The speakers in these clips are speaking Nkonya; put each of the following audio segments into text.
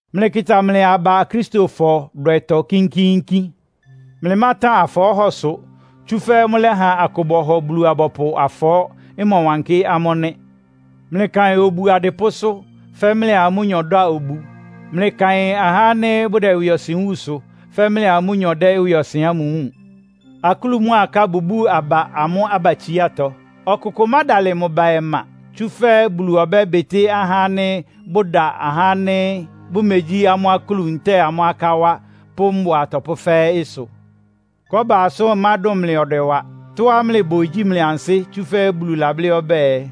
Mlɩkɩta mlɩ aba Akristofɔ dwɛtɔ kínkíínkín. Mlɩmátan afɔɔ́hɔsʋ. Tsúfɛ́ mʋ́lɛ́ha akʋ bɔhɔ Bulu-abɔpʋ afɔɔ́, ɩmɔwankɩ́ amʋ́ nɩ́. Mlɩkaɩn obu adɩpʋ́sʋ́, fɛ́ mlɩa amʋ́nyɔ dá obu. Mlɩkaɩn ahá ánɩ́ bʋdɛ ɩwɩɔsɩn wúunsʋ, fɛ́ mlɩa amʋ́nyɔ dɛ́ ɩwɩɔsɩn ámʋ wúun. Akúlu mʋ́a aká bʋbúu aba amʋ́ abatsiátɔ. Ɔkʋkʋ mádalɩ mʋ ba ɔma, tsúfɛ́ Bulu ɔbɛ́bɩtɩ́ ahá ánɩ́ bʋda ahá ánɩ́ bʋmegyí amʋ́ akúlu ntɛ́ɛ amʋ́ aká wá, pʋ́ mbʋa atɔpʋ́ fɛ́ɛ́ ɩsʋ. Kɔ́ba asʋ́n ɩmádʋn mlɩ ɔdwɛ wa. Tɔ́á mlɩbʋ igyí mlɩ ansɩ́, tsúfɛ́ Bulu lablɩ́ ɔbɛ́ɛ,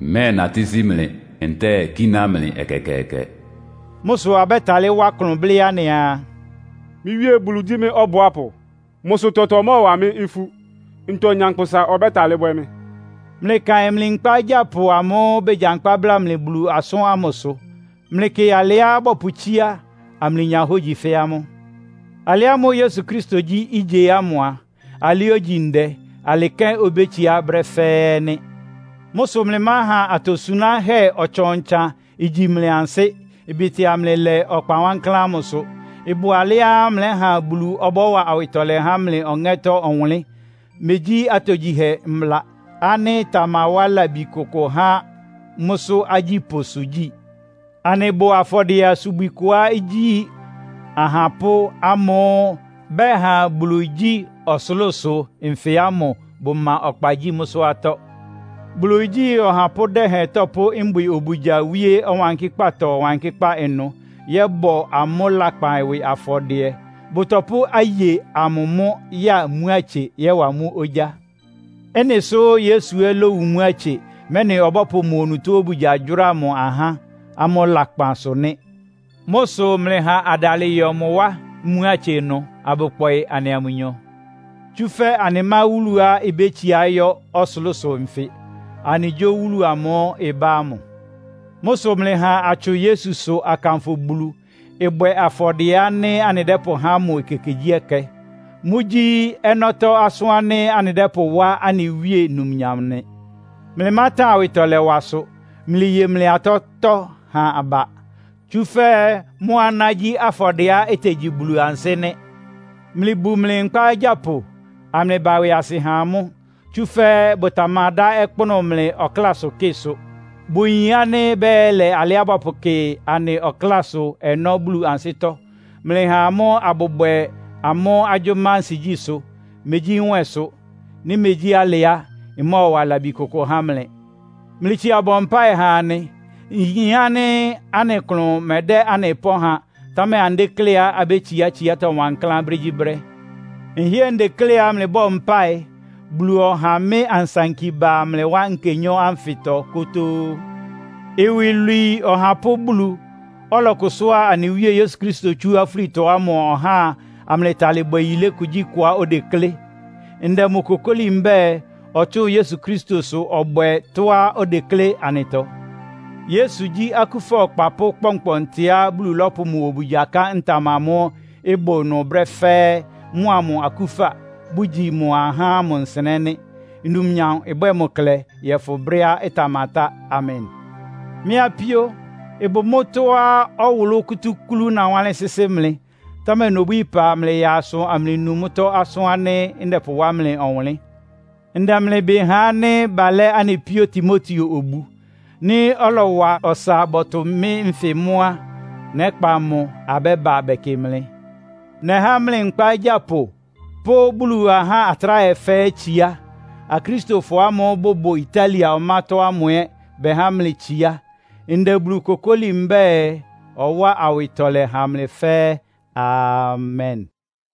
“Mmɛ́ɛnatɩ́ sí mlɩ, ntɛ́ɛ kíná mlɩ ɛkɛkɛɛkɛ.” Mʋ́ sʋ abɛ́talɩ́ wá klʋn blɩ́ anɩaa, “Mɩ́ Wíe Bulu gyí mɩ́ ɔbʋápʋ. Mʋ́ sʋ tɔtɔ mɔ́ɔwa mɩ́ ifú. Ntɔ nyankpʋsa ɔbɛ́talɩ́ bwɛ́ mɩ́?” Mlɩkaɩn mlɩ nkpá agyápʋ amʋ́ʋ́ begyankpá bláa mlɩ Bulu asʋ́n ámʋsʋ. Mlɩkɩ alɩá bɔpʋtsíá, amlɩnya hógyi fɛ́ amʋ́. Alɩ ámʋ́ʋ́ Yesu Kristo gyí ígye ámʋ a, alɩ ógyi ndɛ, alɩ kɛ́n obétsiá brɛ́ fɛ́ɛ́ ɛ́ nɩ́. Mʋ́ sʋ mlɩmáha atosunáhɛ́ ɔtsan-ɔtsan igyi mlɩ ansɩ́, ɩbɩtɩa mlɩ lɛ ɔkpa wankláán ámʋsʋ. Ɩbʋ alɛ́á mlɛ́ha Bulu ɔbɔ́wa awɩtɔlɛ há mlɩ ɔŋɛ́tɔ́ ɔwʋnlɩ́n, megyí atogyihɛ mbla, ánɩ́ ɩtamawá labi kʋkʋ há mʋ́sʋ́ agyípʋ́sʋ gyí. Anɩbʋ afɔdɩɛ-asubwi kʋá igyí ahapʋ́ ámʋ́ʋ́ bɛha Bulu igyí ɔsʋlʋ́sʋ nfɩ ámʋ bʋma ɔkpa gyi mʋ́sʋ́ atɔ́. Bulu igyí ɔhapʋ́ dɛhɛn tɔpʋ́ mbwɩ obugya wíé Ɔwankɩ́kpátɔ Ɔwankɩ́kpá ɩnʋ yɔ́bɔ amʋ́ lakpan ɩwɩ afɔdɩɛ, bʋtɔpʋ́ aye amʋ mʋ́ ya mmuátse, yɔ́wa mʋ́ ogyá. Ɩ́nɩ sʋ́ Yesu ɛ́ lówu mmuátse, mɛ́nɩ ɔbɔ́pʋ mʋ onutó obugya gyʋ́ra mʋ ahá, amʋ́ lakpan sʋ nɩ́. Mʋ́ sʋ mlɩha adalɩ yɔ mʋ wá mmuátse ɩnʋ, abʋkpɔɩ anɩa mʋnyɔ. Tsúfɛ́ anɩmá wúluá ibétsiá yɔ́ ɔsʋlʋ́sʋ nfɩ. Anɩgyó wúlu amʋ́ʋ́ ɩbá ámʋ. Mʋ́ sʋ mlɩha atsʋn Yesusʋ akanfʋ Bulu, ɩbwɛ afɔdɩɛ ánɩ́ anɩdɛ́pʋhá mʋ ekekegyíɛkɛ. Mʋ́gyí ɔnɔ́tɔ́ asʋ́n ánɩ́ anɩdɛ́pʋwá anɩ Wíe numnyam nɩ. Mlɩmátan awɩtɔlɛwasʋ. Mlɩye mlɩ atɔ́tɔ́ ha aba, tsúfɛ́ mʋ́ aná gyí afɔdɩɛá itegyi Bulu ansɩ́ nɩ́. Mlɩbu mlɩ nkpá agyápʋ, amlɩba ɩwɩasɩ ha amʋ́. Tsúfɛ́ bʋtamadá ɔkpʋ́nʋ́ mlɩ ɔklásʋkɩ́ɩ sʋ. Bʋyin ánɩ́ bɛ́yɛlɛ alɩá bɔpʋkɩ anɩ ɔklásʋ ɔnɔ́ Bulu ansɩ́tɔ́. Mlɩha amʋ́ abʋbwɛ amʋ́ agyʋ́má ansigyísʋ́, megyí nwɛsʋ. Nɩ́ megyí alɩ á, ɩmɔ́ɔwa labi kʋkʋ há mlɩ. Mlɩtsia bɔ mpáɩ ha anɩ. Nyin ánɩ́ anɩ klʋn mɛdɛ́ anɩ pɔ́n ha, támɛ anɩdékléá abétsiá tsiátɔ́ wankláán brégyíbrɛ́. Nhɩ́ɛ́ ndekléá mlɩbɔ́ɔ mpáɩ, Bulu ɔháa mɩ́ ansanki ba mlɩ wá nkenyɔ́ ánfɩtɔ kótóó. Iwilwii Ɔhapʋ́ Bulu, ɔlɔkʋsʋ́a anɩ Wíe Yesu Kristo tsú afúlitɔ ámʋ ɔháa amlɩtalɩ bwɛ yilé kugyíkʋá odeklé. Ndɛ mʋ kokóli mbɛ́ɛ, ɔtsʋ́ʋn Yesu Kristosʋ ɔbwɛ tɔ́á odeklé anɩtɔ. Yesu gyí akúfa Ɔkpapʋ́ kpɔnkpɔntɩá Bulu lɔ́pʋ mʋ obugya ká ntam amʋ́ʋ́ ɩbʋ ɩnʋ brɛ́ fɛ́ɛ́, mʋa mʋ akúfa, bʋgyi mʋ ahá amʋ nsɩnɛ́ nɩ́. Numnyam ɩbwɛ́ɛ mʋ klɛ yɔ́fʋn brɛ́á ɩtamatá! Amen. Mɩ́ apíó, ɩbʋ mʋ́tɔ́á ɔwʋlʋ́ kútúklú nawánlɩ́n sɩ́sɩ́ mlɩ. Támɛ nobwíí ɩpa, mlɩyaa asʋ amlɩnu mʋ́tɔ́ asʋ́n ánɩ́ ndɛpʋwá mlɩ ɔwʋnlɩ́n. Ndɛ mlɩ ɩbɩ ha ánɩ́ balɛ́ anɩ píó Timoteo obu. Nɩ́ ɔlɔwa ɔsa bɔtʋ mɩ́ nfɩ mʋ́ á, nɛ́kpa mʋ abɛ́ba bɛkɩ mlɩ. Nɛhá mlɩ nkpá agyápʋ pʋ́ Bulu ahá atráhɛ fɛ́ɛ́ itsiá. Akristofɔ ámʋ́ʋ́ bʋbʋ Italia ɔmátɔ́ ámʋ ɛ́ bɛhá mlɩ itsiá. Ndɛ Bulu kokóli mbɛ́ɛ, ɔwáa awɩtɔlɛ ha mlɩ fɛ́ɛ́! Amen!